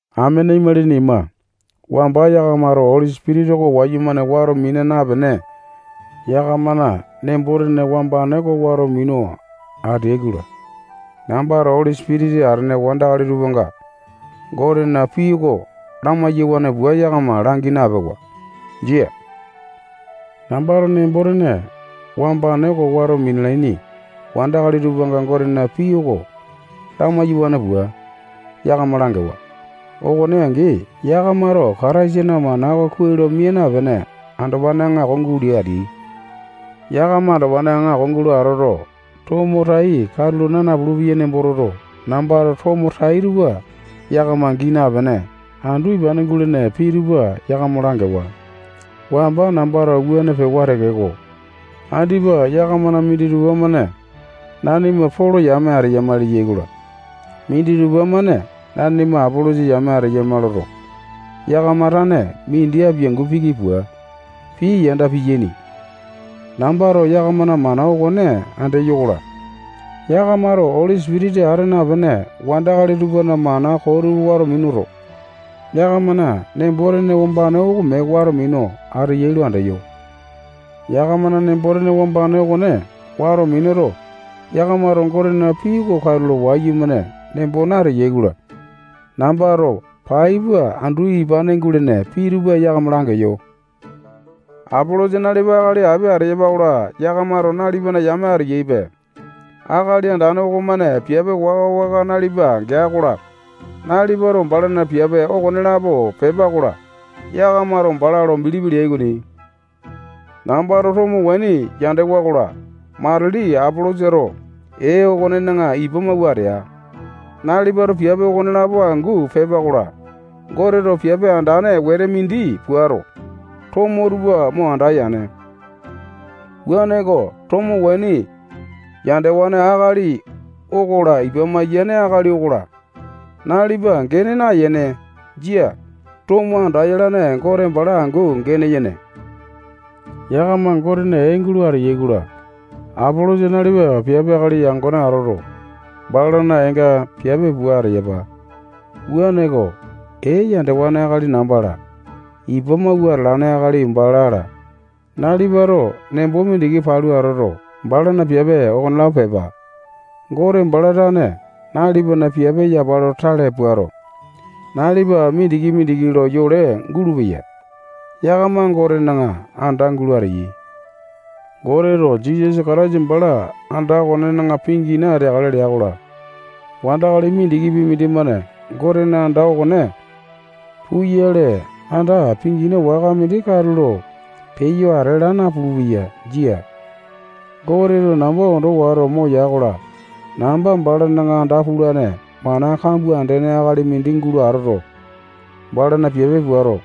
Amene imalini ima, wamba yakamato Oli Sipitisa oko wayumane mina wato napene, yakamana nembo-tene wambane oko wato minu ateai-kola, nambato Oli Sipitisa atene wandakali tupanga Gotena pii oko lamai-yawane pua yakama langi napewa. Jia. Nambato nembo-tene wambane oko wato minalaini wandakali tupanga Gotena pii oko lamai-yawane pua, yakama langewa. Okone angi, yakamato Kataisana mana oko kuai lo mia napene, andopane aŋako gulo ateai. Yakama andopane aŋako gulo atoto, tomo tai katulo naa napulu-peyai nembo toto, nambato tomo tai tupa yakama gii napene, andu ipane gulene pii tupa yakama langewa. Wamba nambato wuane pewa tekeko, andipa yakamana minditupa-mane nanima Polo yame ateyama leyai-kola, minditupa-mane nanima Apolosa yame ateyama loto, yakama tane mindi apiangu piki pua, pii yanda piyaini. Nambato yakamana mana okone andeyo-kola, yakamato Oli Sipitisa ata napene wandakali tupana mana koo tupa wato minuto, yakamana nembo-tene wambane oko mee wato minu ateyai lo andeyo. Yakamana nembo-tene wambane okone wato minuto, yakamato Gotena pii oko katulo wayumane nembo nateyai-kola, nambato pai pua andu ipane gulene pii tupa yakama langeyo. Apolosa nalipa akali api ateyapa-kola, yakamato nalipana yame ateyaipe. Akali Andane okomane piape waka-waka nalipa gea-kola, nalipato balana piape okonelapo pepa-kola, yakamato bala lo bilipi leai okoni. Nambato tomo waini yandewa-kola, matili Apolosato ee okonena ipa mawua atea. Nalipato piape okonelapo angu pepa-kola, Goteto piape andane wete mindi puato, tomo tupa mo anda yane. Wuaneko, tomo waini yandewane akali okola, ipa mayane akali okola, nalipa gene naeyene. Jia. Tomo andayalane Gote bala angu gene yene. Yakama Gotena ee gulo ateyai-kola, Apolosa nalipa piape akali yangone atoto, balana eenga piape pua ateyapa. Wuaneko, ee yandewane akali namba-la, ipa mawua ateane akali bala-la, nalipato nembo mindiki palu atoto, balana piape okonelapo pepa. Gote bala tane nalipana piape yapa lo tale puato, nalipa mindiki-mindiki lo yole gulupeya. Yakama Gotena anda gulo ateyai. Goteto Jisasa Kataisa bala anda okonena pingina ateakale lea-kola, wandakali mindikipi mindimane Gotena anda okone puyale, anda pingina waka mindi katulo peyo ate laa napulu-peya. Jia. Goteto namba ondo wato moya-kola, namba balana anda pulane mana kambua andene akali mindi gulo atoto, balana piape puato,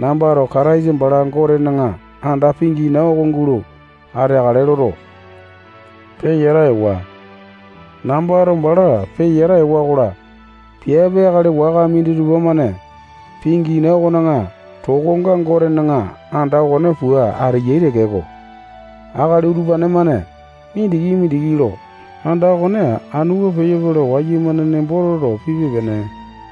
nambato Kataisa bala Gotena anda pingina oko gulo ateakale loto, peyata ewa. Nambato bala peyata ewa-kola, piape akali waka minditupa-mane pingina okona tokonga Gotena anda okone pua ateyai tekeko, akali utupane-mane mindiki-mindiki lo anda okone anu pua peyope lo wayumane nembo toto, pipe-pene.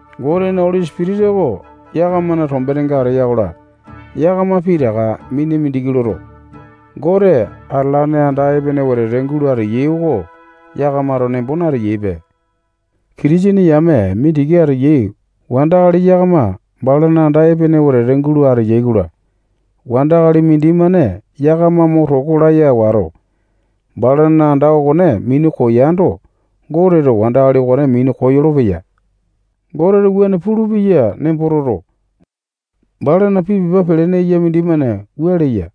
Gotena Oli Sipitisa oko yakamana tombenenga ateya-kola, yakama pitaka mina mindiki loto, Gote atalane anda epene wetete gulo ateyai oko yakamato nembo nateyaipe. Kitisene yame mindiki ateyai wandakali yakama balana anda epene wetete gulo ateyai-kola, wandakali mindimane yakama mo toko laya wato, balana anda okone minu koyando, Goteto wandakali okone minu koyolo-peya. Goteto wuane pulupeya nembo toto, balana pii pepa pelene eya mindimane wua leya: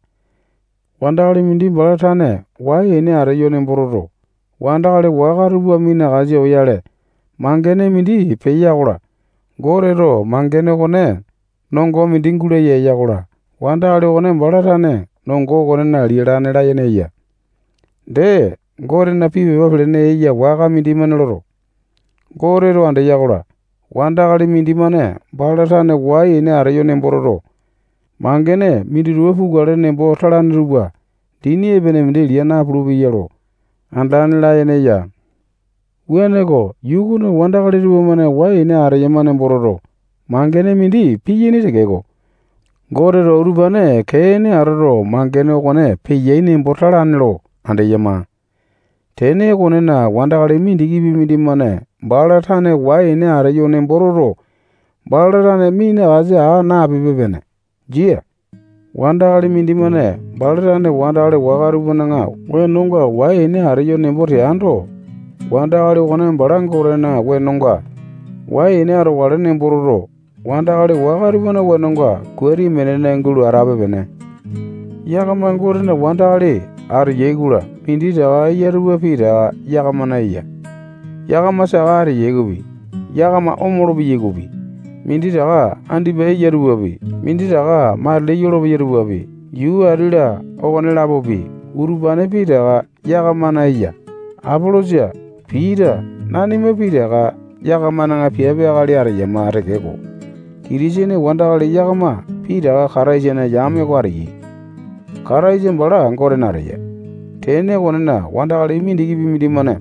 Wandakali mindi bala tane wai-ene ateyo nembo toto, wandakali waka tupa minakasa oyale, mangene mindi peya-kola, Goteto mangene okone nongo mindi gulaya eya-kola, wandakali okone bala tane nongo okonena lialane layene eya. Dee, Gotena pii pepa pelene eya waka mindimane loto, Goteto andeya-kola, wandakali mindimane bala tane wai-ene ateyo nembo toto, mangene minditupa pukale nembo talane tupa dini epene mindi lia napulu-peyai lo andalane layene eya. Wuaneko, yuu okona wandakali tupamane wai-ene ateyai nembo toto, mangene mindi piyaini tekeko, Goteto utupane kee-ene atoto, mangene okone peyai nembo talane lo andeyama. Tene okonena, wandakali mindikipi mindimane bala tane wai-ene ateyo nembo toto, bala tane minakasa aa nape-pene. Jia. Wandakali mindimane bala tane wandakali waka tupana wengonga wai-ene ateyo nembo teando, wandakali okone bala Gotena wenonga wai-ene atokale nembo toto, wandakali waka tupana wenonga kuate minene gulo atape-pene. Yakama Gotena wandakali ateyai-kola, minditaka eya tupa pitaka yakamana eya. Yakama saka ateyai okopi, yakama omolo-peyai okopi, minditaka andipa eya tupapi, minditaka matili yolopeya tupapi, yuu ati-la okone-lapopi, utupane pitaka yakamana eya. Apolosa, Pita, nanima pitaka yakamana piape akali ateyama tekeko, Kitisene wandakali yakama pitaka Kataisana yame oko ateyai. Kataisa bala Gotena ateya. Tene okonena, wandakali mindikipi mindimane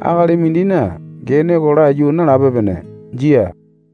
akali mindina gene oko laiyu nalape-pene. Jia.